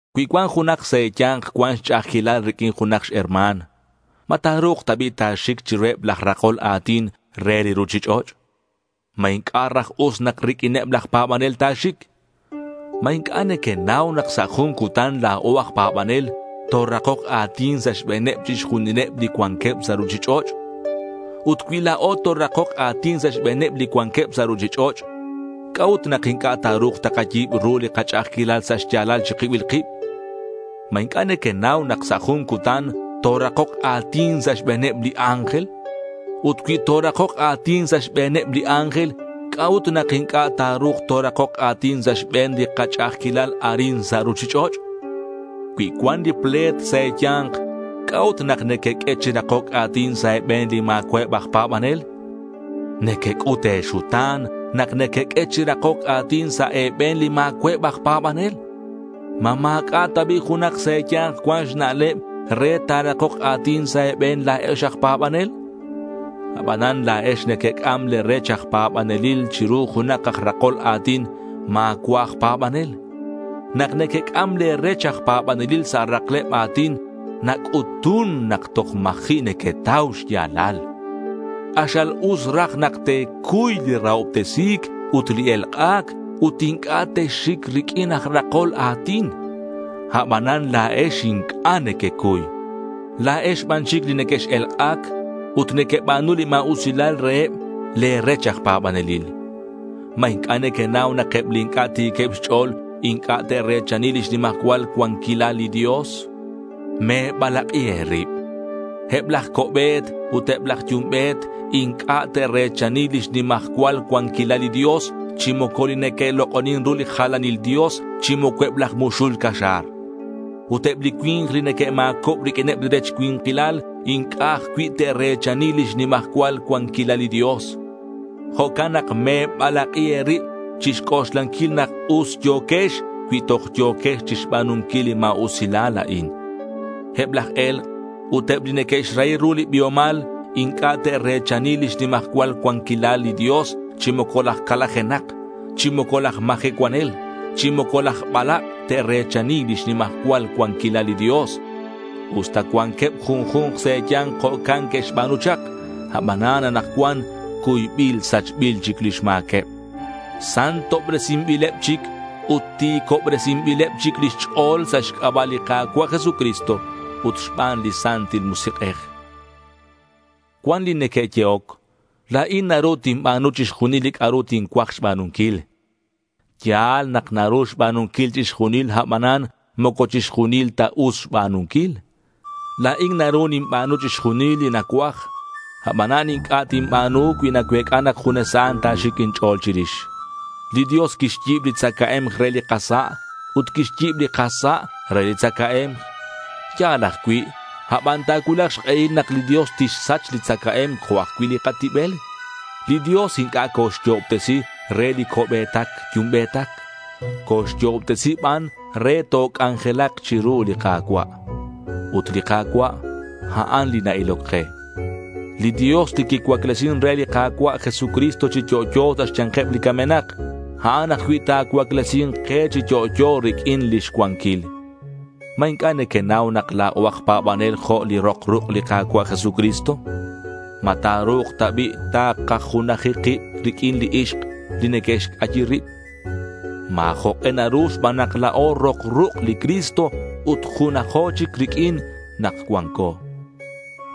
Cui cuan junak sa' e̱ya̱nk cuan xch'a'ajquilal riq'uin junak xherma̱n, ¿ma ta̱ru̱k ta bi' ta̱xic chiruheb laj rakol a̱tin re li ruchich'och'? ¿Ma inc'a' raj us nak riq'uineb laj pa̱banel ta̱xic? ¿Ma inc'a' nequenau nak sa' jun cutan la̱o aj pa̱banel torakok a̱tin sa' xbe̱neb chixjunileb li cuanqueb sa' ruchich'och'? Ut cui la̱o torakok a̱tin sa' xbe̱neb li cuanqueb sa' ruchich'och', ¿c'a'ut nak inc'a' ta̱ru̱k takayi̱b ru li kach'a'ajquilal sa' xya̱lal chi kibil kib? ¿Ma inc'a' nequenau nak sa' jun cutan torakok a̱tin sa' xbe̱neb li ángel? Ut cui torakok a̱tin sa' xbe̱neb li ángel, ¿c'a'ut nak inc'a' ta̱ru̱k torakok a̱tin sa' xbe̱n li kach'a'ajquilal arin sa' ruchich'och'? Cui cuan li ple̱t sa' e̱ya̱nk, ¿c'a'ut nak nequeq'ue chi rakoc a̱tin sa' e̱be̱n li ma̱cua'eb aj pa̱banel? Nequec'ut e̱xuta̱n nak nequeq'ue chi rakoc a̱tin sa' e̱be̱n li ma̱cua'eb aj pa̱banel. ¿Ma ma̱c'a' ta bi' junak sa' e̱ya̱nk cuan xna'leb re ta̱rakok a̱tin sa' e̱be̱n la̱ex aj pa̱banel? Abanan la̱ex nequec'am le̱ rech aj pa̱banelil chiru junak aj rakol a̱tin ma̱cua' aj pa̱banel. Nak nequec'am le̱ rech aj pa̱banelil sa' rakleb a̱tin nac'utun nak toj ma̱ji' nequetau xya̱lal. K'axal us raj nak te̱cuy li rahobtesi̱c ut li elk'a̱c ut inc'a' texxic riq'uin aj rakol a̱tin. Abanan la̱ex inc'a' nequecuy. La̱ex ban chic li nequex-elk'ac ut nequeba̱nu li ma̱usilal reheb le̱ rech aj pa̱banelil. ¿Ma inc'a' nequenau nak eb li inc'a' ti̱queb xch'o̱l inc'a' te're̱chani lix nimajcual cuanquilal li Dios? Me̱balak'i e̱rib. Eb laj co'be̱t ut eb laj yumbe̱t inc'a' te're̱chani lix nimajcual cuanquilal li Dios, chi moco li neque'lok'onin re li jalanil dios, chi moco eb laj muxul caxa̱r. Ut eb li cui̱nk li neque'ma̱cob riq'uineb li rech cui̱nkilal inc'a' ajcui' te're̱chani lix nimajcual cuanquilal li Dios. Jo'can nak me̱balak'i e̱rib chi xc'oxlanquil nak us yo̱quex cui toj yo̱quex chixba̱nunquil li ma̱usilal a'in. Eb laj e̱lk' ut eb li neque'xrahi ru li biomal inc'a' te're̱chani lix nimajcual cuanquilal li Dios, chi moco laj calajenak, chi moco laj majecuanel, chi moco laj balak' te're̱chani lix nimajcual cuanquilal li Dios. Usta cuanqueb junju̱nk sa' e̱ya̱nk jo'can que'xba̱nu chak, abanan anakcuan cuybil sachbil chic lix ma̱queb. Santobresinbileb chic ut ti̱cobresinbileb chic lix ch'o̱l sa' xc'aba' li Ka̱cua' Jesucristo ut xban li Santil Musik'ej. Cuan li neque'yehoc: La̱in naru tinba̱nu chixjunil li c'a'ru tincuaj xba̱nunquil. Ya̱l nak naru xba̱nunquil chixjunil abanan moco chixjunil ta us xba̱nunquil. La̱in naru ninba̱nu chixjunil li nacuaj, abanan inc'a' tinba̱nu cui nacuec'a nak junes a'an ta̱xic inch'o̱l chirix. Li Dios quixyi̱b li tzacae̱mk re li kasa' ut quixyi̱b li kasa' re li tzacae̱mk. Ya̱l ajcui', aban ta̱cuulak xk'ehil nak li Dios tixsach li tzacae̱mk jo' ajcui' li katibel. Li Dios inc'a' coxyo'obtesi re li co'be̱tac yumbe̱tac. Coxyo'obtesi ban re nak toc'anjelak chiru li Ka̱cua'. Ut li Ka̱cua' a'an li na-iloc ke. Li Dios li quicuaclesin re li Ka̱cua' Jesucristo chi yo'yo sa' xya̱nkeb li camenak, a'an ajcui' ta̱cuaclesi̱nk ke chi yo'yo riq'uin lix cuanquil. ¿Ma inc'a' nequenau nak la̱o aj pa̱banel jo' li rok ruk' li Ka̱cua' Jesucristo? ¿Ma ta̱ru̱k ta bi' takajunaji kib riq'uineb li ixk li neque'xc'ayi rib? Ma̱ jok'e naru xban nak la̱o rok ruk' li Cristo ut junajo chic riq'uin nak cuanco.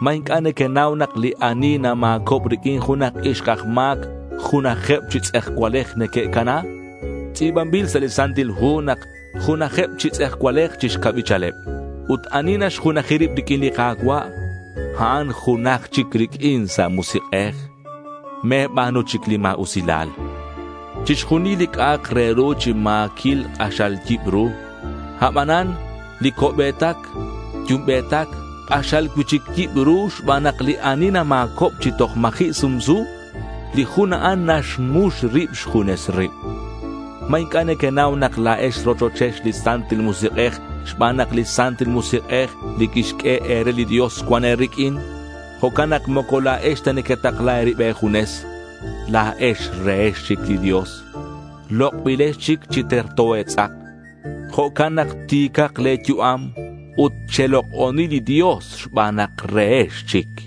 ¿Ma inc'a' nequenau nak li ani nama̱cob riq'uin junak ixk aj ma̱c junajeb chi tz'ejcualej neque'cana? Tz'i̱banbil sa' li Santil Hu nak junajakeb chi tz'ejcualej chi xcabichaleb. Ut ani naxjunaji rib riq'uin li Ka̱cua', a'an junaj chic riq'uin sa' musik'ej. Me̱ba̱nu chic li ma̱usilal. Chixjunil li c'a'ak re ru chi ma̱quil k'axal yibru. Abanan li co'be̱tac yumbe̱tac k'axal cui'chic yibru xban nak li ani nama̱cob chi toj ma̱ji' sumsu, li jun a'an naxmux rib xjunes rib. ¿Ma inc'a' nequenau nak la̱ex rochochex li Santil Musik'ej xban nak li Santil Musik'ej li quixq'ue e̱re li Dios cuan e̱riq'uin? Jo'can nak moco la̱ex ta nequetakla e̱rib e̱junes. La̱ex rehex chic li Dios. Lok'bilex chic chi terto e̱tz'ak. Jo'can nak ti̱cak le̱ yu'am ut chelok'oni li Dios xban nak rehex chic.